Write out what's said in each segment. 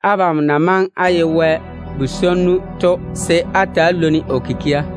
Abam na maŋe á ye Wɛ bu-swonnu to, se á ta‑á lwoni o kikia.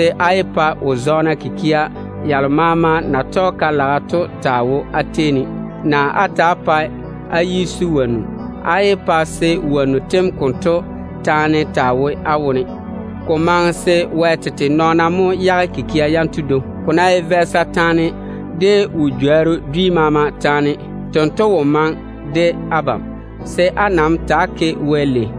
Á nam yé pa kikia yalo maama na tɔge ka-laga to, naa wo-zɔɔna dwi maama taa wo á tei ne. Á yé pa á yi taa sui á dwonna wonnu. Nam yé pa se wonnu tem konto taane taa wo á wone. Ko maŋe se Wɛ tete nɔɔna mo yage kikia yanto dwoŋi. Ko ná ye vɛɛsa taane, de wo-jworru dwi maama taane, tento wo maŋe de abam, se á nam ta‑á ke Wɛ lei.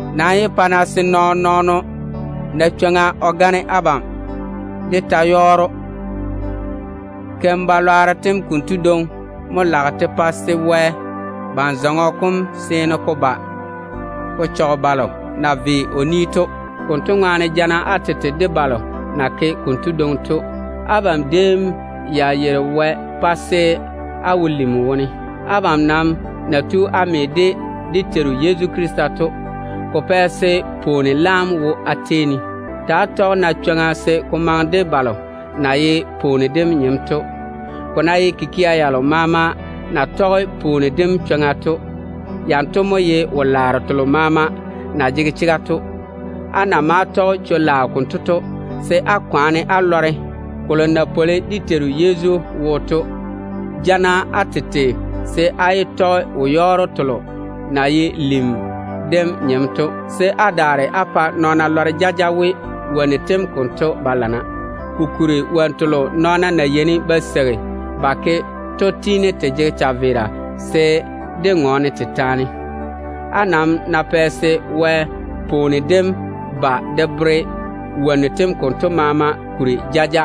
Nam yé pa-na se nɔɔn-nɔɔno na chwoŋa o gane abam de ta-yɔɔro. Keim-balwaaro tem konto dwoŋi mo lage te pa se Wɛ ban-lom dem zaŋe de balo na ve o ni to. Konto ŋwaane lɔŋe-na balo na ke konto dwoŋi to. Abam déem ya yeiri Wɛ pa se á wo lim wone. Abam nam na tu á me de dé Teiru Yezu Krista to, ko pɛ se pwooni laam wo á tei ne. Ta‑á tɔge-na chwoŋa se ko maŋe de balo na ye pwooni dem nyem tei. Ko ná ye kikia yalo maama na tɔge pwooni dem chwoŋa to, yanto mo ye wo-laaro telo maama na jege chega to. Á na maa tɔge chwo-laao konto to, se á kwaane á lɔre kolo na pwoli dé Teiru Yezu wo to. Ja-na á tete se á lɔŋe wo-yɔɔro telo na ye lim dem nyem to, se á daare á pa nɔɔna lɔre jaja we, wonnu tem konto ba lana. Kokuri wonnu telo Wɛ-lwɛɛna bam na yeini ba seigi ba ke to tiini te jege chaveera se dé ŋɔɔne te taane. Á nam ná pɛ se Wɛ pwooni dem ba de bere wonnu tem konto maama kuri jaja,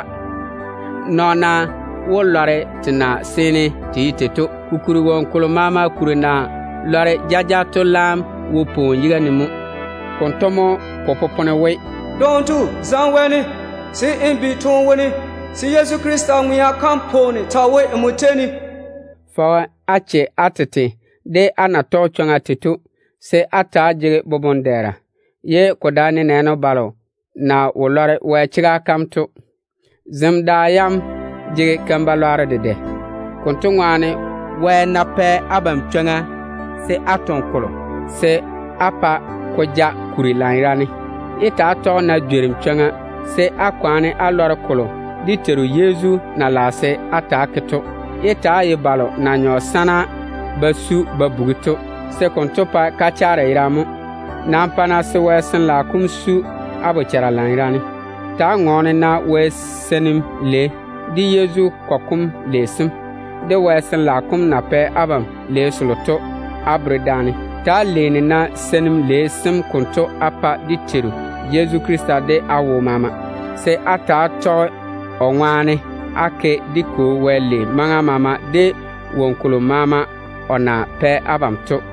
nɔɔna wó lɔre te na seene te ye tei to. Kokuri woŋo kolo maama kuri na lɔre jaja to laam wo pwooni yiga ne mo. Konto ŋwaane mo ba yeini ba tɛ ba we: “Dondɔɔno, zaŋe wɛɛne, se n bi toone wone, se Yezu Krista mo nye pwooni n baŋa ne.” Ta‑á yei-na á tete de á totoŋ-naga na ye tei to, se á ta‑á jege boboŋ-dɛɛra, ye ko dae nenɛɛne balo na wo lɔre Wɛ chega kam to. Zem da yanto jege keim-balwaaro dedɛ. Konto ŋwaane, Wɛ ná pɛ abam chwoŋa se á toŋe kolo, se á pa ko ja kuri lanyerane. Yé ta‑á tɔge-na jworim chwoŋa, se á nam kwaane á lɔre kolo dé Teiru Yezu na lage se á ta‑á ke to. Yé ta‑á ye balo na nyɔ sana ba su ba bugi to, se konto pae kachaare yerane mo. Nam pa-na se Wɛ Sin-laao kom su á bochara lanyerane. Ta‑á ŋɔɔne-na Wɛ seinim lei, de Yezu kɔgɔ kom lei sem, de Wɛ Sin-laao kom na pɛ abam lei selo to á bere daane. Ta‑á leeni-na Wɛ tia lei sem konto á pa dé Teiru Yezu Krista de á wo maama, se á ta‑á tɔge o ŋwaane á ke dé Kwo Wɛ lei maŋa maama, de woŋo kolo maama o na pɛ abam to.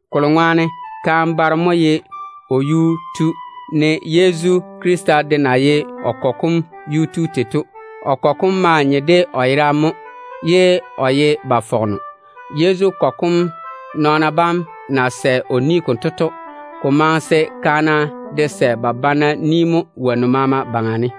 Kolo ŋwaane kaane baro mo ye o yuu tu, ne Yezu Krista de na ye o kɔgɔ kom yuu tu tei to. O kɔgɔ kom maa nye de o yera yam mo, ye o ye ba fɔgeno. Yezu kɔgɔ kom nɔɔna bam na sɛ ba pa‑o konto to, ko maŋe se kaana de sɛ ba pa ba banna mo wonnu maama baŋa ne.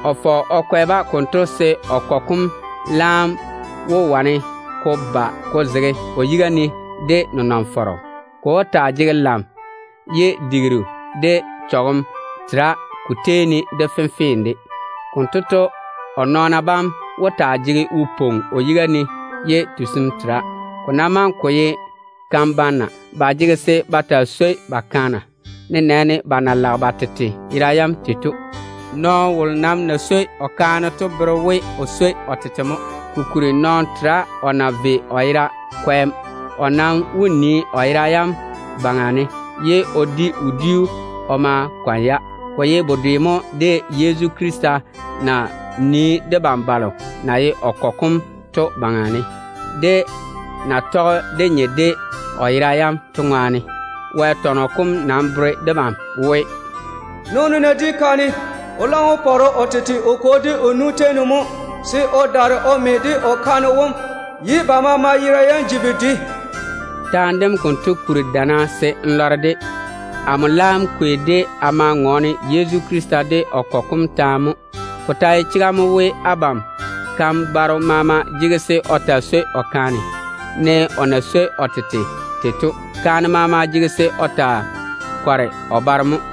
O fɔge o kwɛ-ba konto se o kɔgɔ kom laam wane ko ba ko zege o yiga ne de nenɔŋ-fɔrɔ. Ko wó taa jege lam, ye digiru de chɔgem tera ko tei ne de fenfee de. Konto to, o nɔɔna bam wó taa ye wose o yiga ne ye tusim tera. Ko ná maŋe ko ye kan-banna, ba jege se ba taa swoi ba kaana, nenɛɛne ba na lage ba tete yera yam tei to. Nɔɔno wolo nam na swoi o kaane to bere we o swoi o tete mo. Kokuri nɔɔno tera o na vae o yera kwɛɛm. O nam wó nii ya baŋa ne, ye o di wodiu o ma kɔne-ya. Ko ye bedwe mo de Yezu Krista na nii debam balo na ye o nɔn-kɔgɔ kom to baŋa ne, dé na tɔge dé nye de o yera yam to ŋwaane. Wɛ tɔnɔ kom nam bere debam we, “Baaro ná di kaane, o boboŋa daa ba tɔge o kwo de o nu boboŋa. O laam yeini o me de o kaane wom mo, ye ba balei bam ji yera dedoa.” Taane dem konto bere wo-lilirru mo. Amo laam kwei-de a ma ŋɔɔne Yezu Krista de o kɔgɔ kom taane mo. Ko ta ye chega mo we, abam kan-baro maama jege se o taa swoi o kaane, ne o na swoi o tete tei to. Kaane maama de jege se o taa nege o baro mo.